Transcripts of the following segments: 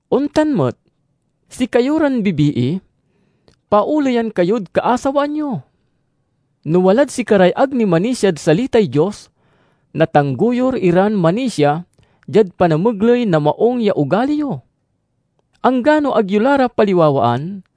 Ontan met, sikayo ran bibii, paoleyan kayod kaasawaan yo. No walad sikaray ag ni manisiad salitay Dios natanggoyur iran manisia, diad panamegley na maung ya ogali yo. Anggano ag yo la ra paliwawaan,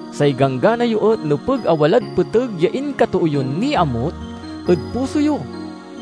Say ganggana yo et nepeg a walad peteg ya inkatoo yon niamut ed puso yo,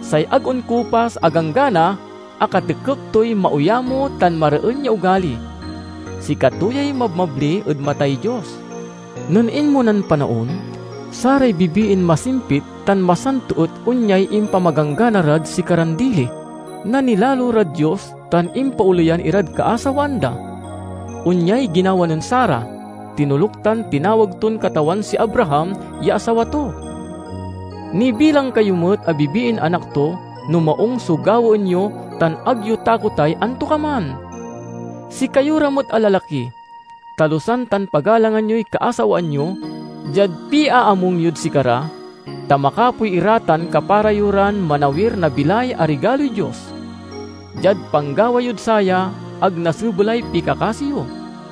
say ag onkupas a ganggana a katekep toy maoyamo tan mareen ya ogali. Sikato yay mabmabli ed matay Dios. Nen inmonan panaon, saray bibiin masimpit tan masanto et onyay impamaganggana rad sikaran dili: nanilalo rad Dios tan impaoleyan irad kaasawaan da. Onyay ginawa nen Sara. Tinoluk tan tinawag ton katawan si Abraham ya asawa to. Nibilang kayo met a bibiin anak to, no maung so gawaen yo tan ag yo takotay antokaman. Sikayo ra met a lalaki, talusan tan pagalangan yoy kaasawaan yo diad piaamung yod sikara, ta makapoy ira tan kapara yo ran manawir na bilay a rigaloy Dios. Diad panggawa yod saya, ag nasebelay pikakasi yo.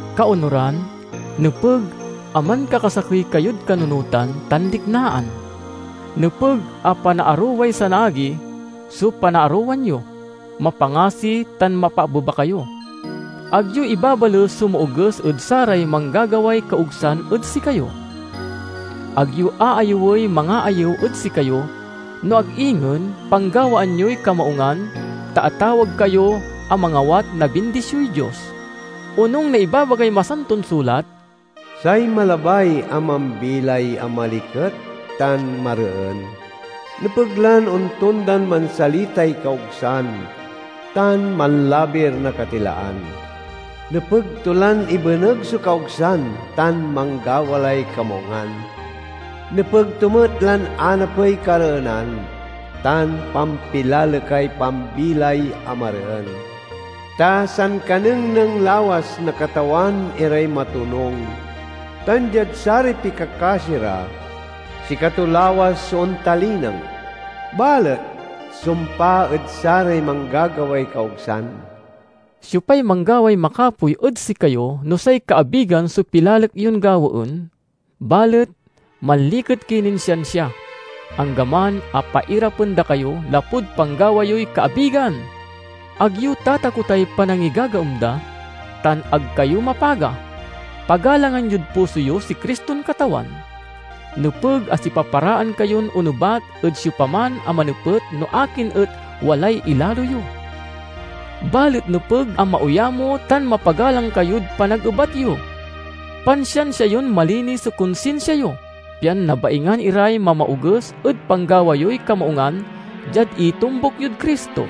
Kaonuran, nepeg a mankakasakey kayod kanunotan tan liknaan. Nepeg a panaaroway sanaagi so panaarowan yo; mapangasi tan mapaabeba kayo. Ag yo ibabales so maoges ed saray manggagaway kaogsan ed sikayo. Ag yo aayewey mangaayew ed sikayo, no ag ingen panggawaan yoy kamaungan, ta atawag kayo a mangawat na bindisioy Dios. Onung na ibabagay Masanton Sulat, "Say malabay a mambilay a maliket tan mareen, nepeg lan ontondan mansalitay kaogsan tan manlabir na katilaan. Nepeg to lan ibeneg so kaogsan tan manggawa lay kamaungan; nepeg to met lan anapey kareenan tan pampilalekay pambilay a mareen. Ta sankanengneng lawas na Katawan iray matonung, tan diad saray pikakasi ra sikato lawas so ontalineng; balet sumpa ed saray manggagaway kaogsan." Siopay manggaway makapoy ed sikayo no say kaabigan so pilalek yon gawaen? Balet manliket ki nin siansia, anggaman a pairapen da kayo lapud panggawa yoy kaabigan! Ag yo tatakotay panangigagaem da, tan ag kayo mapaga. Pagalangan yod puso yo si Criston Katawan. Nepeg a sipaparaan kayon onebat ed siopaman a manepet no akin et walay ilalo yo. Balet nepeg a maoyamo tan mapagalang kayod panagebat yo. Pansiansia yon malinis so konsinsia yo, pian nabaingan iray mamaoges ed panggawa yoy kamaungan diad itombuk yod Cristo.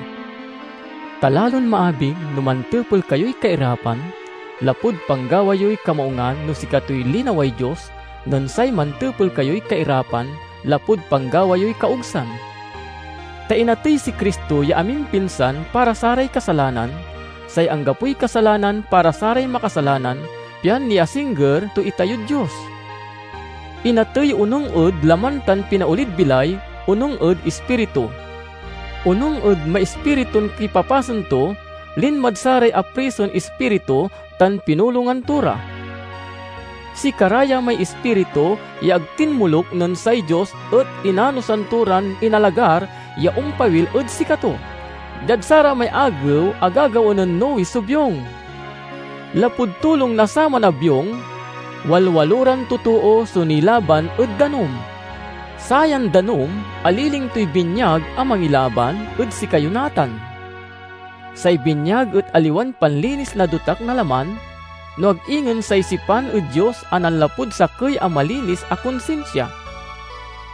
Ta lalon maabig no mantepel kayoy kairapan, lapud panggawa yoy kamaungan no sikatoy linaway Dios, nen say mantepel kayoy kairapan, lapud panggawa yoy kaogsan. Ta inatey si Cristo ya amimpinsan para saray kasalanan, say anggapoy kasalanan para saray makasalanan, pian niasingger to itayod Dios. Inatey onung ed laman tan pinaolid bilay onung ed ispiritu. Onung ed maispiritun kipapasen to, linmad saray aprison ispiritu tan pinulongan to ra. Sikara ya may ispiritu ya ag tinmoluk nen say Dios et inanosan to ran inalagar ya ompawil ed sikato, diad saramay agew a gagawaen nen Noe so biong. Lapud tulong na saman a biong, walwaloran totoo so nilaban ed danum. Sayan danum aliling toy binyag a mangilaban ed sikayo natan. Say binyag et aliwan panlinis na dotak na laman, no ag ingen say sipan ed Dios a nanlapud sakey a malinis a konsinsia.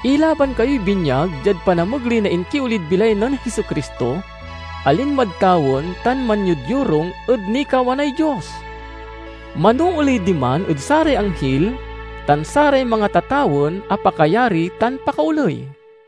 Ilaban kayoy binyag diad panamegley na inkiolid bilay nen Jesu-Cristo, a linmad tawen tan manyodyorung ed nikawanay Dios. Manooley diman ed saray anghil, tan saray mangatatawen a pakayari tan pakaoley.